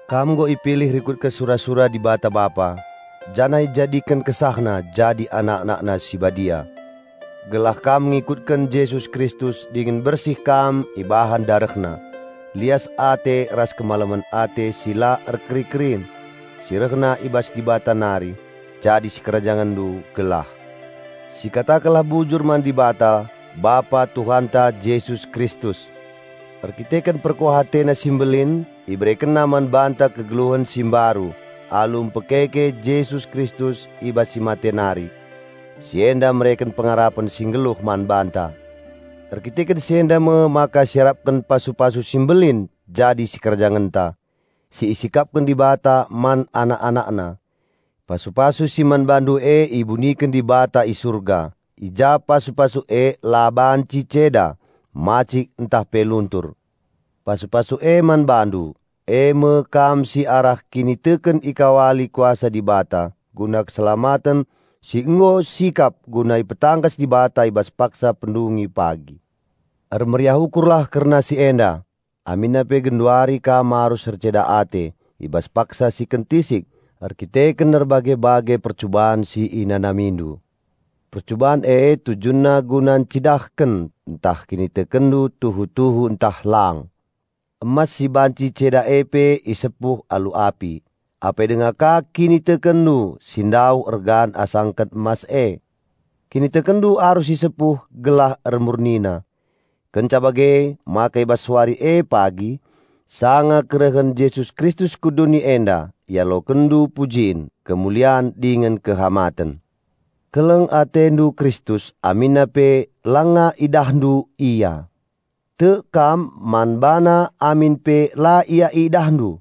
Kam nggo ipilih rikutken sura-sura Dibata Bapa, janah ijadiken KesahNa jadi anak-AnakNa si badia, gelah kam ngikutken Jesus Kristus dingen bersih kam ibahan DarehNa. Lias ate ras kemalemen ate si la erkeri-kerin, si rehna i bas Dibata nari, jadi sikerajangenndu gelah. Sikatakenlah bujur man Dibata, Bapa Tuhanta Jesus Kristus! Erdandanken perkuah AteNa si mbelin, IberekenNa man banta kegeluhen si mbaru, alu mpekeke Jesus Kristus i bas si mate nari. Si enda mereken pengarapen si nggeluh man banta. Erkiteken si enda me maka siarapken pasu-pasu si mbelin jadi sikerajangenta, si isikapken Dibata man anak-AnakNa. Pasu-pasu si man bandu e ibuniken Dibata i surga, i ja pasu-pasu e la banci ceda, macik, ntah pe luntur. Pasu-pasu e man bandu, e me kam si arah kiniteken ikawali kuasa Dibata guna keselamaten si nggo sikap guna ipetangkas Dibata i bas paksa pendungi pagi. Ermeriah ukurlah kerna si enda, aminna pe genduari kam arus erceda ate i bas paksa si kentisik erkiteken erbage-bage percuban si inanamindu. Percuban e tujunna guna ncidahken ntah kinitekenndu tuhu-tuhu ntah lang. Emas si banci ceda e pe isepuh alu api, apai denga ka kinitekenndu si ndauh ergan asangken emas e. Kinitekenndu arus isepuh gelah ermurnina. Kenca bage maka i bas wari e pagi, sanga kerehen Jesus Kristus ku doni enda, ialokenndu pujin, kemulian, dingen kehamaten. Keleng atendu Kristus aminna pe langa idahndu Ia. Tek kam man BaNa amin pe la Ia idahndu.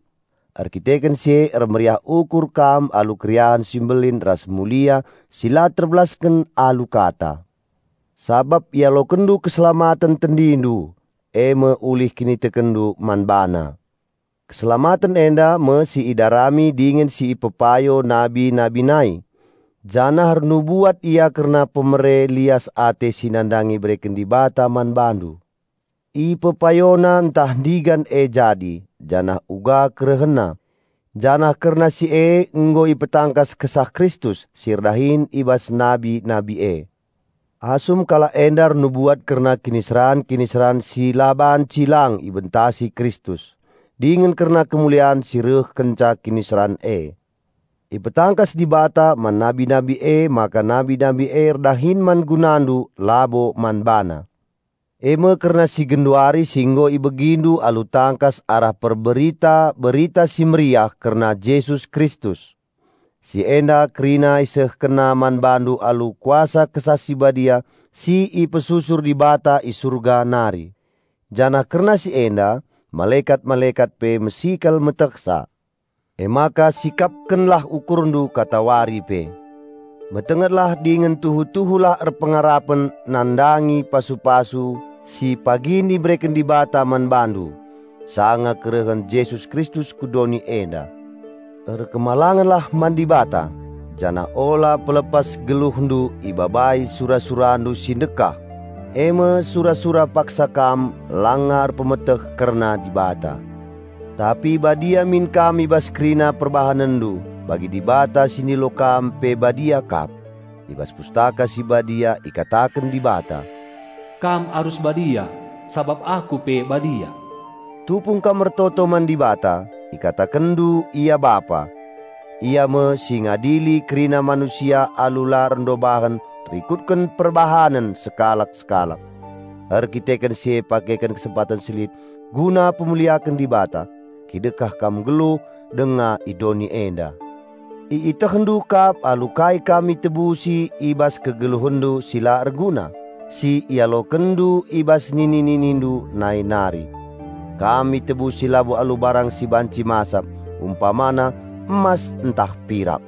Erdandanken si e ermeriah ukur kam alu keriahen si mbelin ras mulia si la terbelasken alu kata, sabap ialokenndu keselamaten tendindu, e me ulih kinitekenndu man BaNa. Keselamaten enda me si idarami dingen si ipepayo nabi-nabi nai, janah ernubuat ia kerna pemere lias ate si nandangi ibereken Dibata man bandu. Ipepayona ntah ndigan e jadi, janah uga kerehenna. Janah kerna si e nggo ipetangkas Kesah Kristus si erdahin i bas nabi-nabi e, asum kalak enda ernubuat kerna kiniseran-kiniseran si la banci lang ibentasi Kristus dingen kerna kemulian si reh kenca kiniseran e. Ipetangkas Dibata man nabi-nabi emaka nabi-nabi e erdahin man gunandu labo man bana; e me kerna si genduari si nggo ibegindu alu tangkas arah perberita Berita Si Mehuli kerna Jesus Kristus. Si enda kerina isehkenna man bandu alu kuasa Kesah Si Badia si ipesusur Dibata i Surga nari. Janah kerna si enda, malekat-malekat pe mesikel metehsa. Emaka sikapkenlah ukurndu katawari pe. Metengetlah dingen tuhu-tuhu lah erpengarapen nandangi pasu-pasu si pagin ibereken Dibata man bandu, sanga kerehen Jesus Kristus ku doni enda. Patuhlah man Dibata, janah ula pelepas geluhndu ibabai sura-surandu si ndekah, e me sura-sura paksa kam langa erpemeteh kerna Dibata. Tapi badia min kam i bas kerina perbahanenndu, bagi Dibata si ndilo kam pe badia kap. I bas Pustaka Si Badia ikataken Dibata, "Kam arus badia, sabap Aku pe badia." Tupung kam ertoto man Dibata, ikatakenndu Ia Bapa. Ia me si ngadili kerina manusia alu la erndobahen rikutken perbahanen sekalak-sekalak. Erdandanken si e pakeken kesempaten si lit guna pemuliaken Dibata, kidekah kam nggeluh denga i doni enda. Ietehndu kap alu kai kam itebusi i bas kegeluhenndu si la erguna, si ialokenndu i bas nini-ninindu nai nari. Kam itebusi labo alu barang si banci masap, umpamana emas ntah pirak.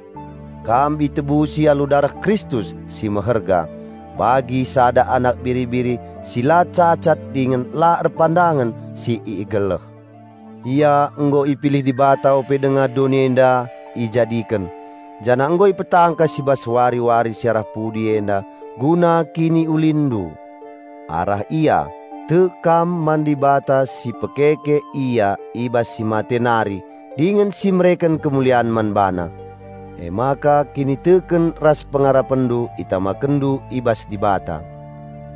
Kam itebusi alu dareh Kristus si meherga, bagi sada anak biri-biri si la cacat dingen la erpandangen si igeleh. Ia nggo ipilih Dibata ope denga doni enda ijadiken, janah nggo ipetangkas i bas wari-wari si arah pudi enda guna kiniulinndu. Arah Ia, tek kam man Dibata si pekeke Ia i bas si mate nari dingen si mereken kemulian man BaNa. Emaka kiniteken ras pengarapenndu itamakenndu i bas Dibata.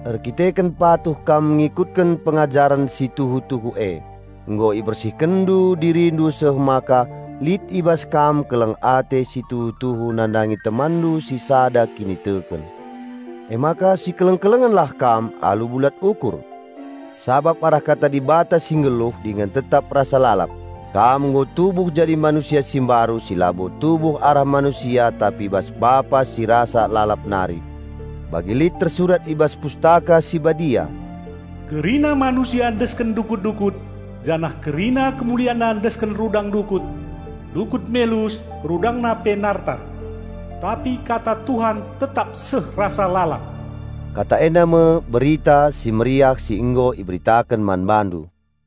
Erdandanken patuh kam ngikutken pengajaren si tuhu-tuhu e, nggo ibersihkenndu dirindu seh maka lit i bas kam keleng ate si tuhu-tuhu nandangi temanndu si sada kiniteken. Emaka sikeleng-kelengenlah kam alu bulat ukur. Sabap arah kata Dibata si nggeluh dingen tetap rasa lalap, kam nggo tubuh jadi manusia si mbaru si labo tubuh arah manusia tapi i bas Bapa si rasa lalap nari. Bagi lit tersurat i bas Pustaka Si Badia, "Kerina manusia desken dukut-dukut, janah kerina kemulianna desken rudang dukut. Dukut melus, rudangna pe nartar; tapi kata Tuhan tetap seh rasa lalap." Kata enda me Berita Si Mehuli si nggo iberitaken man bandu.